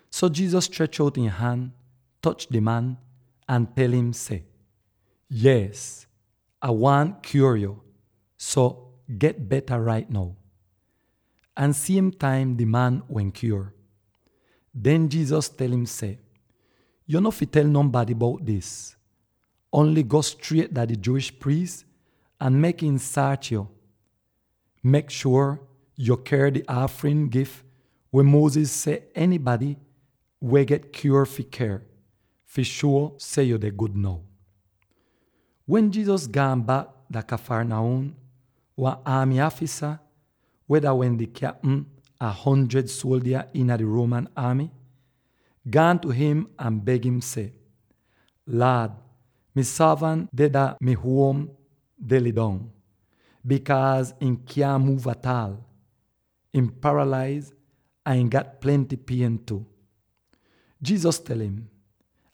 So Jesus strech out ihn han, toch di man, ahn tel im seh, “Yees, Ah waahn kyuor yo, so get beta rait now!” Ahn siem taim di man wehn kyuor. Den Jesus tel im seh, “Yo no fi tel nonbady bout dis; ongl go striet dah di Jewish priis ahn mek im saach yo. Mek shuor yo ker di aafrin gif weh Moses seh enybady weh get kyuor fi ker, fi shuo seh yu deh gud now.” Wen Jesus gaan bak dah Capernaum, wan aamy aafisa —weh dah wehn di kyapm a wan hundred suoldya iina di Roman aamy— gaan tu im ahn beg im seh, “Laad, mi sorvant deh dah mi huom deh lidong, bikaaz ihn kyaahn muuv ataal; ihn paralaiz ahn ihn gat plenty pien tu.” Jesus tel im,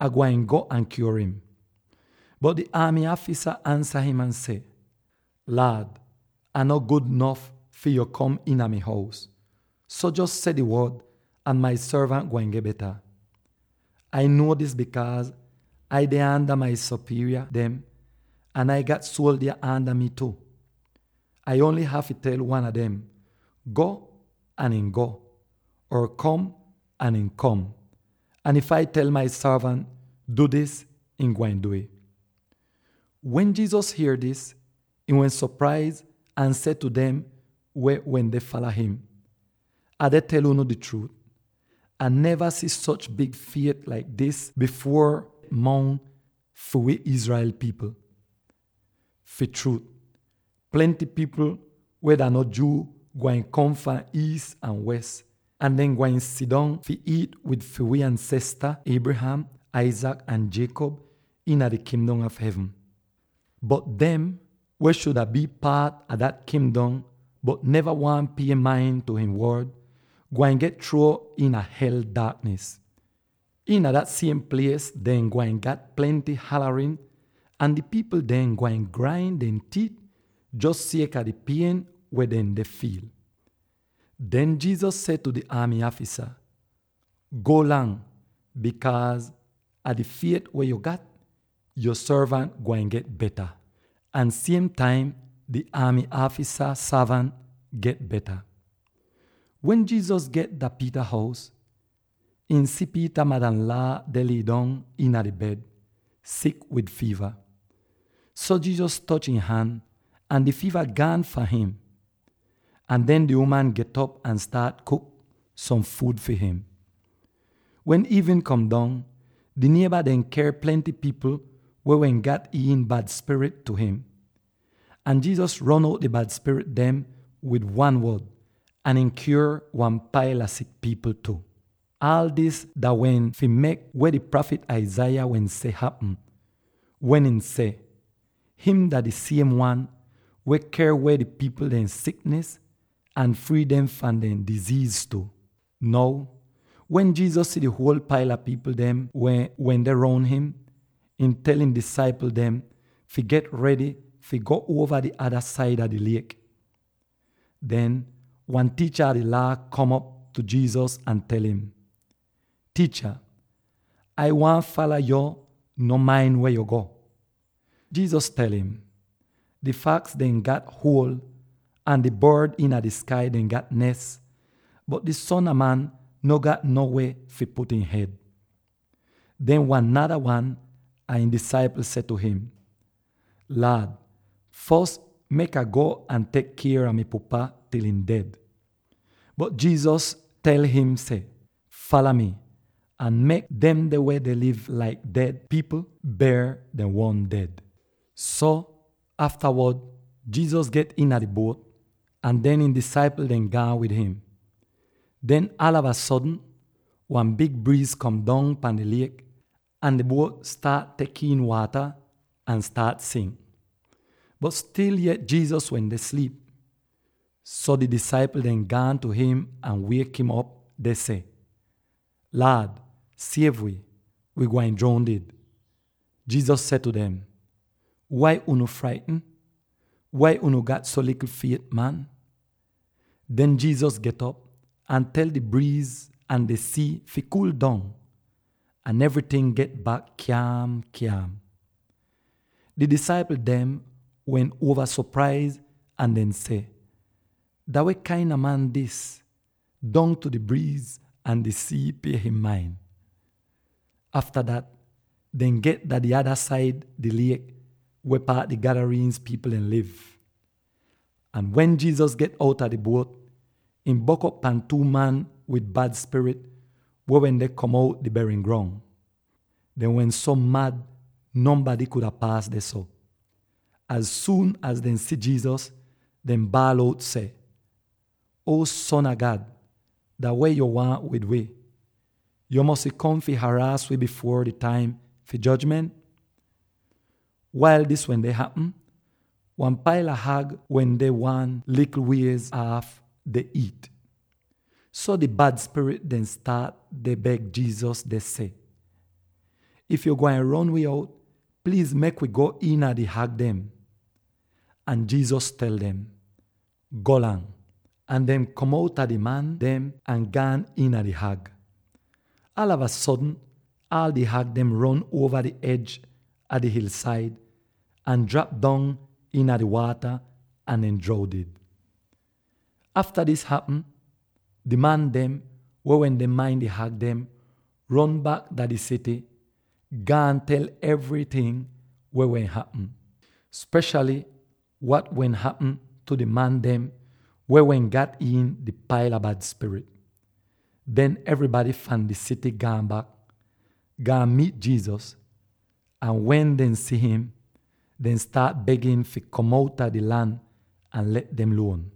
“Ah gwain go ahn kyuor im.” Bot di aamy aafisa ansa im seh, “Laad, Ah no gud nof fi yo kom iina mi hous. So, jos seh di wod ahn mi sorvant gwain get beta. Ai nuo dis bikaaz Ai deh aanda mi sopierya dem, ahn Ai gat suoldya aanda mii tu. Ai ongl hafy tel wan a dem, ‘Go!’ ahn ihn go, or ‘Kom!’ ahn ihn kom. Ahn if Ah tel mi sorvant, ‘Du dis!’ ihn gwain du'ih.” Wen Jesus hier dis, ihn wehn sopraiz ahn seh tu dem weh wende fala im, “Ah deh tel unu di chruut: Ah neva si soch big fiet laik dis bifuor mongs wi Israel pipl dem. Fi chruut, plenty pipl weh dah no Jew gwain kom fahn iis ahn wes, Or: “…gwain kom fahn aal uova…” ahn dehn gwain sidong fi iit wid fi wi ansesta Abraham, Isaac, ahn Jacob iina di Kingdom a Hevn. Bot dem weh shuda bii paat a dat kingdom bot neva waahn pie main tu ihn wod gwain get chruo iina hel daaknis. Iina dah siem plies dehn gwain gat plenty halarin ahn di pipl dehn gwain grain dehn tiit jos sieka di pien weh dehn deh fiil.” Den Jesus seh tu di aamy aafisa, “Golang! Bikaaz a di fiet weh yo gat, yo sorvant gwain get beta.” Ahn siem taim di aamy aafisa sorvant get beta! Wen Jesus get dah Peter hous, ihn si Peter madanlaa deh lidong iina di bed, sik wid fiiva. So Jesus toch ihn han, ahn di fiiva gaan fahn im. Ahn den di uman get'op ahn staat kuk som fuud fi im! Wen iivnin kom dong, di nieba dehn ker plenty pipl weh wehn gat iin bad spirit tu im. Ahn Jesus ron out di bad spirit dem wid wan wod, ahn ihn kyuor wan paila sik pipl tu. Aal dis dah wehn fi mek weh di prafit Isaiah wehn seh hapm, wen ihn seh, “Him dah di siem wan weh ker weh di pipl dehn siknis ahn frii dehn fahn dehn diziiz tu.” Now, wen Jesus si di huol paila pipl dem weh wende roun im, ihn tel ihn disaipl dem fi get redy fi go uova di ada saida di liek. Den wan tiicha a di Laa kom op tu Jesus ahn tel im, “Tiicha, Ai waahn fala yo no main weh yo go.” Jesus tel im, “Di faks dem gat huol ahn di bord iina di skai dem gat nes, bot di Son a Man no gat no weh fi put ihn hed.” Den wan nada wan a ihn disaipl seh tu im, “Laad, fos mek Ah go ahn tek kier a mi pupa til ihn ded.” Bot Jesus tel im seh, “Fala mi, ahn mek demde weh deh liv laik ded pipl ber dehn uon ded.” So, aftawod Jesus get iina di buot, ahn den ihn disaipl dehn gaan wid im. Den aalava sodn wan big briiz kom dong pahn di liek, ahn di buot staat tek iin waata ahn staat sink. Bot stil yet Jesus wende sliip. So di disaipl dem gaan tu im ahn wiek'im op deh seh, “Laad, siev wi! Wi gwain droundid!” Jesus seh tu dem, “Wai unu fraitn; wai unu gat so likl fiet, man?” Den Jesus get'op ahn tel di briiz ahn di sii fi kuul dong, ahn evryting get bak kyaam-kyaam! Di disaipl dem wehn uova sopraiz ahn dehn seh, “Dah weh kain a man dis? Dongtu di briiz ahn di sii pie im main!” Afta dat, dehn get dah di ada saida di liek weh paat di Garasenes pipl dem liv; ahn wen Jesus get outa di buot, ihn bok'op pan two man wid bad spirit weh wende kom outa di berin grong. Dehn wehn so mad nonbady kuda paas dehso. Az suun az dehn si Jesus, dehn baal out seh, “Uo, Son a God, dah weh yo waahn wid wi? Yo mosy kom fi haraas wi bifuor di taim fi jojment?” Wail dis wende hapm, wan paila hag wende wan likl wiez aaf deh iit. So di bad spirit dem staat deh beg Jesus deh seh, “If yo gwain ron wi out, pliiz mek wi go iina di hag dem.” Ahn Jesus tel dem, “Golang!” ahn dehn kom outa di man dem ahn gaan iina di hag. Aalava sodn aal di hag dem ron uova di ej a di hilsaid, ahn drap dong iina di waata ahn dehn droundid! Afta dis hapm, di man dem, weh wende main di hag dem, ron bak dah di sity, gaan tel evryting weh wehn hapm, speshaly wat wehn hapm tu di man dem weh wehn gat iin di paila bad spirit. Den evrybady fahn di sity gaan bak, gaan miit Jesus, ahn wen dehn si'im, dehn staat beg im fi kom outa di lan ahn let dem luon.